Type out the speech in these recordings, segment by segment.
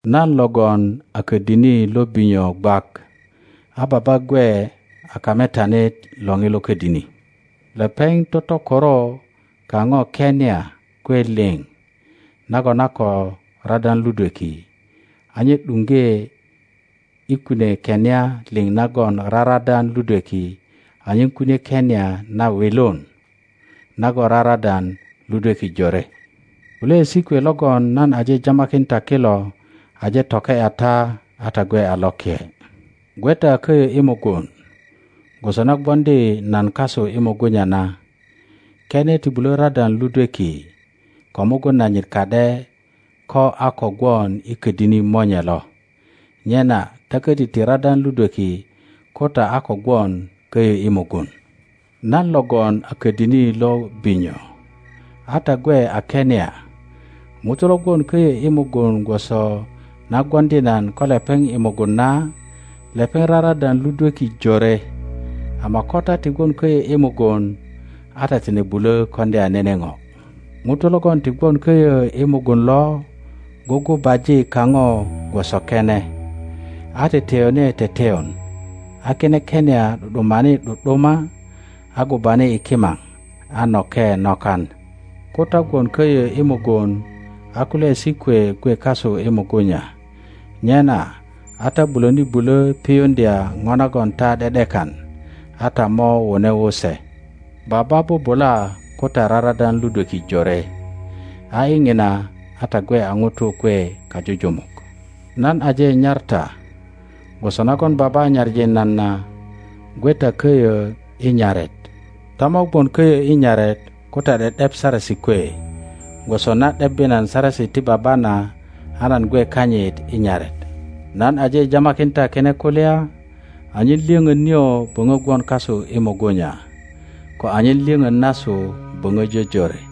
Nan logon a ködini lo binyo gwak, a Baba gwe a kametanit lo ŋilo ködini. Lepeŋ totokoro kaŋo kenia kwe liŋ nagon a ko radan ludweki, a nye ’duŋge i kune kenia liŋ nagon raradan ludweki anyen kunie kenia na wilun nagon raradan ludweki jore. Kulyaesi kwe logon nan aje jamakin ta kilo aje toke ’ya ta a ta gwe a loke. Gwe ta köyö i mugun, gwoso na gwoŋdi nan kasu i mugunya na. Kene ti bulö radan ludweki ko mugun nanyit ka ’de ko a ko gwon i ködini monye lo, nyena ta köti ti radan ludweki ko ta a ko gwon köyö i mugun. Nan logon a ködini lo binyo, a ta gwe a kenia. ŋuto lo gwon köyö i mugun gwoso na gwoŋdi nan ko lepeŋ i mugun na, lepeŋ raradan ludweki jore, ama ko ta ti gwon köyö i mugun a ta tine bulö koŋdya nene ŋo. Ŋuto logon ti gwon köyö i mugun lo gugubaji kaŋo gwoso kene, a teteyone teteyon. A kine kenia ’du ’dumani ’du’duma, a gubani i kimaŋ, a noke nakan. Ko ta gwon köyö i mugun a kulyaesi kwe gwe kasu i mugunya, nyena a ta bulöni bulö piyuŋdya ŋo nagon ta ’de ’dekan, a ta mo wune wu se. Baba bubula ko ta raradan ludweki jore; a i ŋina a ta gwe a ŋutu kwe kajujumuk. Nan aje nyar ta gwoso nagon Baba nyaŋi nan na. Gwe ta köyö i nyaret. Ta mo gwon köyö i nyaret ko ta ’de ’dep saresi kwe, gwoso na ’debbi nan saresi ti Baba na a nan gwe kanyit i nyaret. Nan aje jamakin ta kine kulya anyen lyöŋön nio böŋö gwon kasu i mugunya, ko anyen lyöŋön nasu böŋö jojore.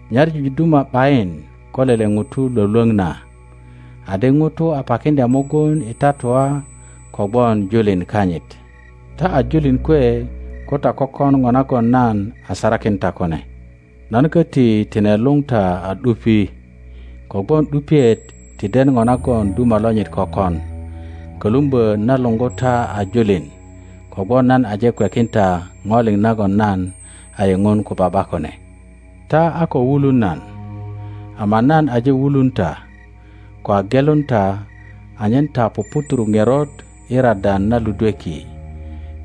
Nyaŋu duma ’bayin ko lele ŋuto lwölwöŋ na, adi ŋuto a pakiŋdya mugun i tatua kogwon julin kanyit. Ta a julin kwe ko ta kökon ŋo nagon nan a sarakin ta kune. Nan köti tine luŋ ta a ’dupi, kogwon ’dupiet ti den ŋo nagon duma lonyit kökon; kölumbö nan luŋgu ta a julin kogwon nan aje kwekin ta ŋo liŋ nagon nan a yiŋun ko Baba kune. Ta a ko wulun nan, ama nan aje wulun ta ko a gelun ta anyen ta puputuru ŋerot i radan na ludweki.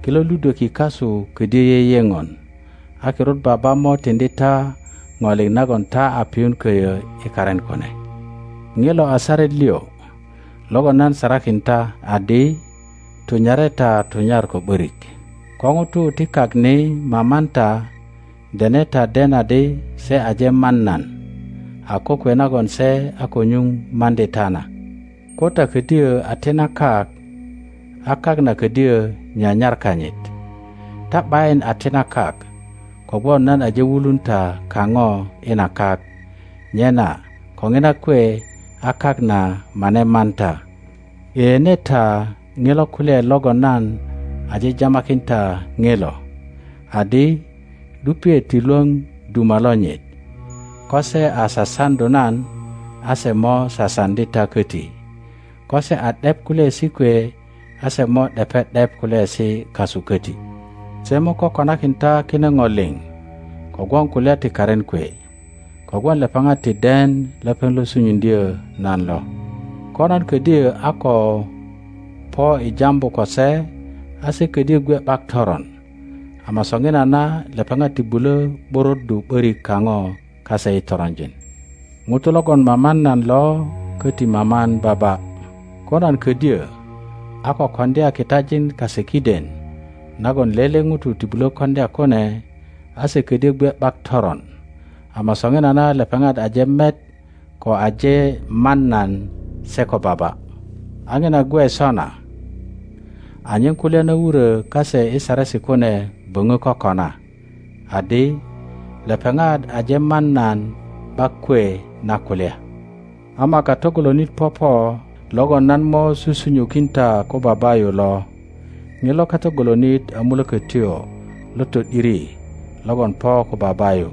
Kilo ludweki kasu ködyö yeyeŋon. A kirut Baba mo tiŋdi ta ŋo liŋ nagon ta a piyun köyö i karin kune. Ŋilo a saret liŋ logon nan sarakin ta adi, Tunyare ta tunyar ko ’börik. Ko ŋutu ti kak ni maman ta, dene ta den adi se aje man nan a kokwe nagon se a ko nyuŋ maŋdi ta na. Ko ta ködyö a ti na kak, a kak na ködyö nyanyar kanyit. Ta ’bayin a ti na kak kogwon nan aje wulun ta kaŋo i na kak, nyena ko ŋina kwe a kak na mane man ta. Yeyene ta ŋilo kulyaet logon nan aje jamakin ta ŋilo, adi, ’Dupiet ti lwöŋ duma lonyit. Ko se a sasaŋdu nan, a se mo sasaŋdi ta köti; ko se a ’dep kulyaesi kwe, a se mo ’depe ’dep kulyaesi kasu köti. Se mo kokonakin ta kine ŋo liŋ kogwon kulya ti karin kwe, kogwon lepeŋat ti den lepeŋ lo sunyuŋdyö nan lo. Ko nan ködyö a ko po i jambu ko se, ase ködyö gwe ’bak toron; ama soŋinana lepeŋat ti bulö ’buruddu ’börik kaŋo kase i toronjin. Ŋuto logon maman nan lo köti maman Baba. Ko nan ködyö a ko koŋdya kitajin kase kiden nagon lele ŋuto ti bulö koŋdya kune, a se ködyö gwe ’bak toron; ama soŋinana lepeŋat aje met ko aje man nan se ko Baba. a ŋina gwe sona anyen kulya na wuro kase i Saresi kune böŋö kokona, adi, Lepeŋat aje man nan ’bak kwe na kulya. Ama Kato golonit popo logon nan mo susunyukin ta ko Baba yu lo. Ŋilo Kato golonit a Mulökötyo lo to ’diri logon po ko Baba yu,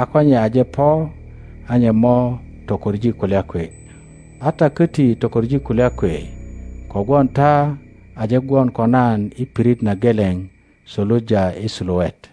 a ko nye aje po a nye mo tokoŋ kulya kwe. a ta köti tokoŋ kulya kwe kogwon ta aje gwon ko nan i pirit na geleŋ suluja i suluet.